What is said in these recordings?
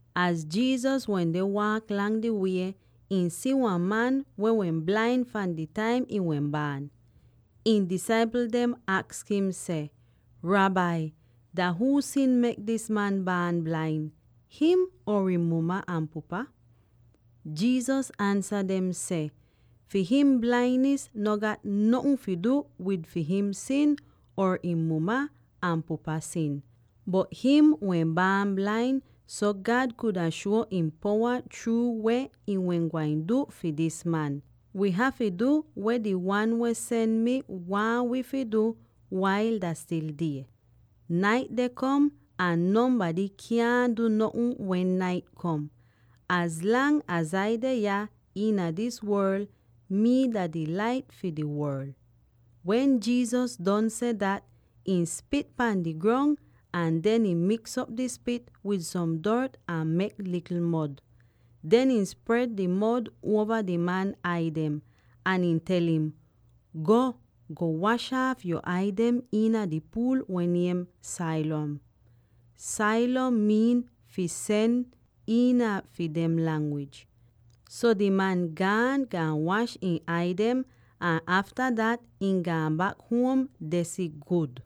Az Jesus wende waak lang di wie, ihn si wan man weh wehn blain fahn di taim ihn wehn baan. Ihn disaipl dem aks im seh, “Rabbi, dah huu sin mek dis man baan blain, him, or ihn muma ahn pupa?” Jesus ansa dem seh, “Fi him blainis no gat notn fi du wid fi him sin, or ihn muma ahn pupa sin. Bot him wehn baan blain, so God kuda shuo ihn powa chruu weh ihn wehn gwain du fi dis man. Wi hafy du weh di Wan weh sen mi waahn wi fi du wail dah stil die. Nait deh kom ahn nonbady kyaahn du notn wen nait kom. Az lang az Ai deh yah iina dis worl, mii dah di Lait fi di worl.” Wen Jesus don seh dat, ihn spit pahn di grong ahn den ihn miks'op di spit wid som dort ahn mek likl mod. Den ihn spred di mod uova di man ai dem, ahn ihn tel im, “Go, go wash aaf yo ai dem iina di puul weh niem Siloam.” (Siloam miin “fi Sen” iina fi dem langwij.) So di man gaan, gaan wash ihn ai dem, ahn afta dat, ihn gaan bak huom deh si gud!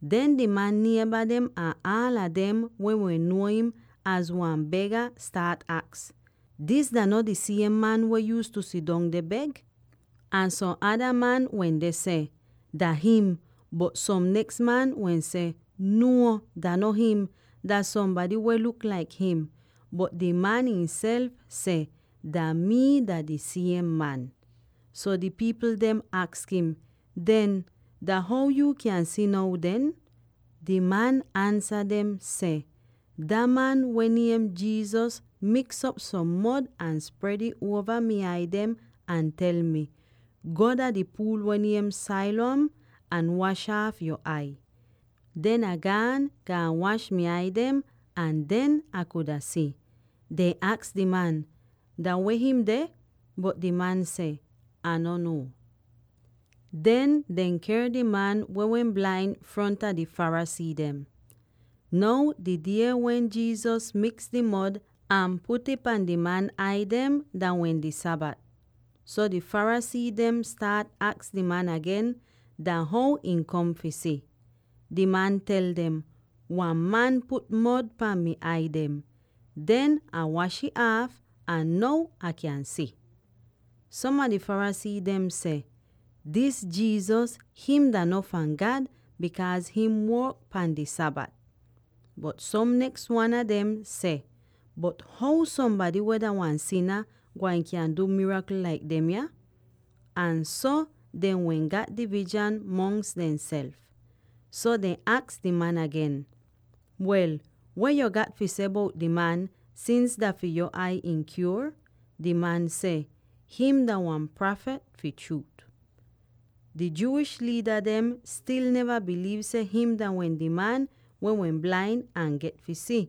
Den di man nieba dem ahn aala dem weh wehn nuo im laik wan bega staat aks, “Dis dah no di siem man weh yuuztu sidong deh beg?” Ahn som ada man wende seh, “Dah him!” Bot som neks wan seh, “Nuo, dah no him; dah sombady weh luk laik him.” Bot di man ihnself seh, “Dah mii dah di siem man!” So di pipl dem aks im, “Den, dah how yuu kyan si now den?” Di man ansa dem seh, “Dah man weh niem Jesus miks'op som mod ahn spred ih uova mi ai dem ahn tel mi, ‘Go dah di puul weh niem Siloam ahn wash aaf yo ai.’ Den Ah gaan, gaan wash mi ai dem —ahn den Ah kuda si!” Dehn aks di man, “Dah weh him deh?” Bot di man seh, “Ah no nuo.” Den dehn ker di man weh wehn blain fronta di Pharisee dem. Now di die wen Jesus miks di mod ahn put'ih pahn di man ai dem dah wehn di Sabat. So di Pharisee dem staat aks di man agen dah how ihn kom fi si. Di man tel dem, “Wan man put mod pahn mi ai dem. Den Ah wash ih aaf, ahn now Ah kyan si!” Som a di Pharisee dem seh, “Dis Jesus, him dah no fahn God, bikaaz him work pahn di Sabat.” Bot som neks wan a dem seh, “Bot how sombady weh dah wan sina gwain kyan du mirakl laik demya?” Ahn so dehn wehn gat divizhan mongs dehnself. So dehn aks di man agen, “Wel, weh yuu gat fi seh bout di man, sins dah fi yo ai ihn kyuor?” Di man seh, “Him dah wan prafit fi chruut.” Di Jewish liida dem stil neva biliiv seh him dah wehn di man weh wehn blain ahn get fi si,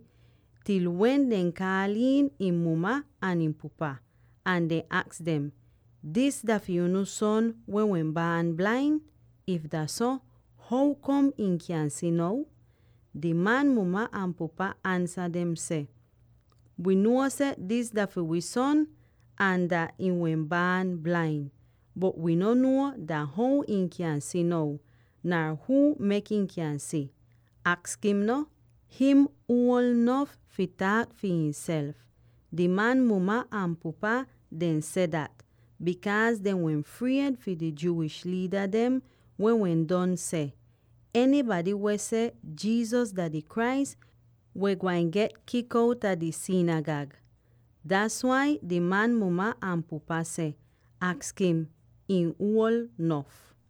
til wen dehn kaal iin ihn muma ahn ihn pupa, ahn dehn aks dem, “Dis dah fi unu son weh wehn baan blain? If dah so, how kom ihn kyan si now?” Di man muma ahn pupa ansa dem seh, “Wi nuo seh dis dah fi wii son, ahn dat ihn wehn baan blain. Bot wii no nuo dah how him kyan si now, nar huu mek ihn kyan si. Aks him no. Him uol nof fi taak fi ihnself.” Di man muma ahn pupa dehn seh dat, bikaaz dehn wehn fried fi di Jewish liida dem, weh wehn don seh, “Enybady weh seh Jesus dah di Christ wehn gwain get kik outa di sinigag.” Das wai di man muma ahn pupa seh, “Aks him; ihn uol nof.”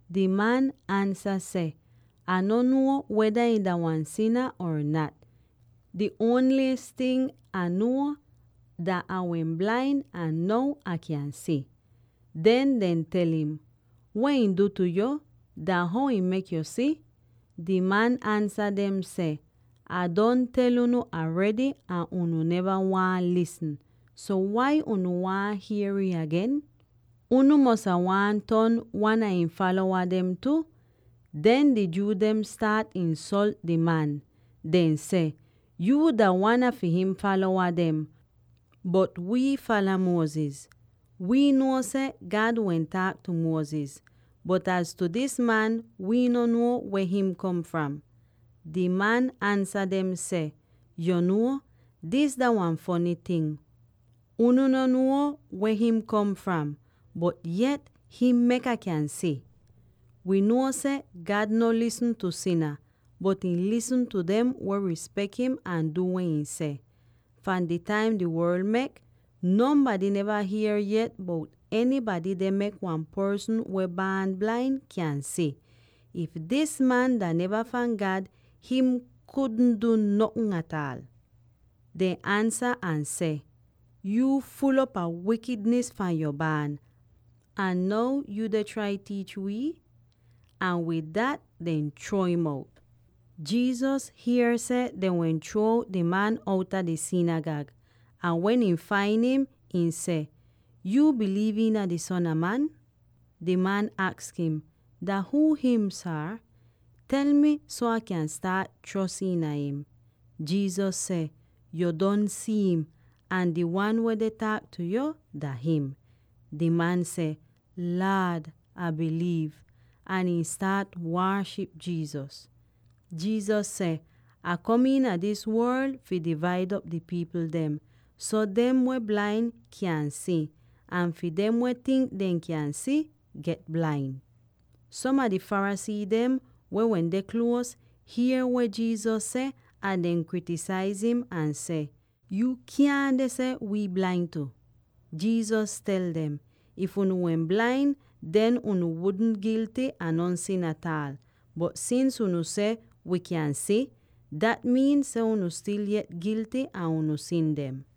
Di man ansa seh, “Ah no nuo weda ihn dah wan sina or nat. Di ongl ting Ah nuo, dah Ah wehn blain, ahn now Ah kyan si!” Den dehn tel im, “Weh ihn du tu yo? Dah how ihn mek yo si?” Di man ansa dem seh, “Ah don tel unu aredy ahn unu neva waahn lisn. So wai unu waahn hier'ih agen? Unu mosa waahn ton wan a ihn falowa tu?” Den di Jew dem staat insolt di man; dehn seh, “Yuu dah wan a fi him falowa, bot wii fala Moses. Wii nuo seh God wehn taak tu Moses, bot az tu dis man, wii no nuo weh him kom fram.” Di man ansa dem seh, “Yo nuo; dis dah wan fony ting. Unu no nuo weh him kom fram, bot yet him mek Ah kyan si! Wi nuo seh God no lisn tu sina, bot ihn lisn tu dem weh rispek im ahn du weh ihn seh. Fahn di taim di worl mek, nonbady neva hier yet bout enybady deh mek wan porsn weh baan blain kyan si. If dis man dah neva fahn God, him kudn du notn ataal.” Dehn ansa ahn seh, “Yuu ful'op a wikidnis fahn yo baan, ahn now yuu deh trai tiich wii?” Ahn wid dat dehn chruo im out. Jesus hier seh dehn wehn chruo out di man outa di sinigag, ahn wen ihn fain im, ihn seh, “Yuu biliiv iina di Son a Man?” Di man aks im, “Dah huu him, Saar? Tel mi so Ah kyan staat chros iina im.” Jesus seh, “Yu don si'im, ahn di Wan weh deh taak tu yo, dah him.” Di man seh, “Laad, Ah biliiv!” ahn ihn staat waaship Jesus. Jesus seh, “Ah kom iina dis worl fi divaid op di pipl dem; so dem weh blain kyan si, ahn fi dem weh tink dehn kyan si, get blain.” Som a di Pharisee dem, weh wende kluos, hier weh Jesus seh ahn dehn kritisaiz im ahn seh, “Yuu kyaahn deh seh wii blain tu!” Jesus tel dem, “If unu wehn blain, den unu wudn gilty a non sin ataal. Bot sins unu seh, ‘Wii kyan si,’ dat miin seh unu stil yet gilty a unu sin dem.”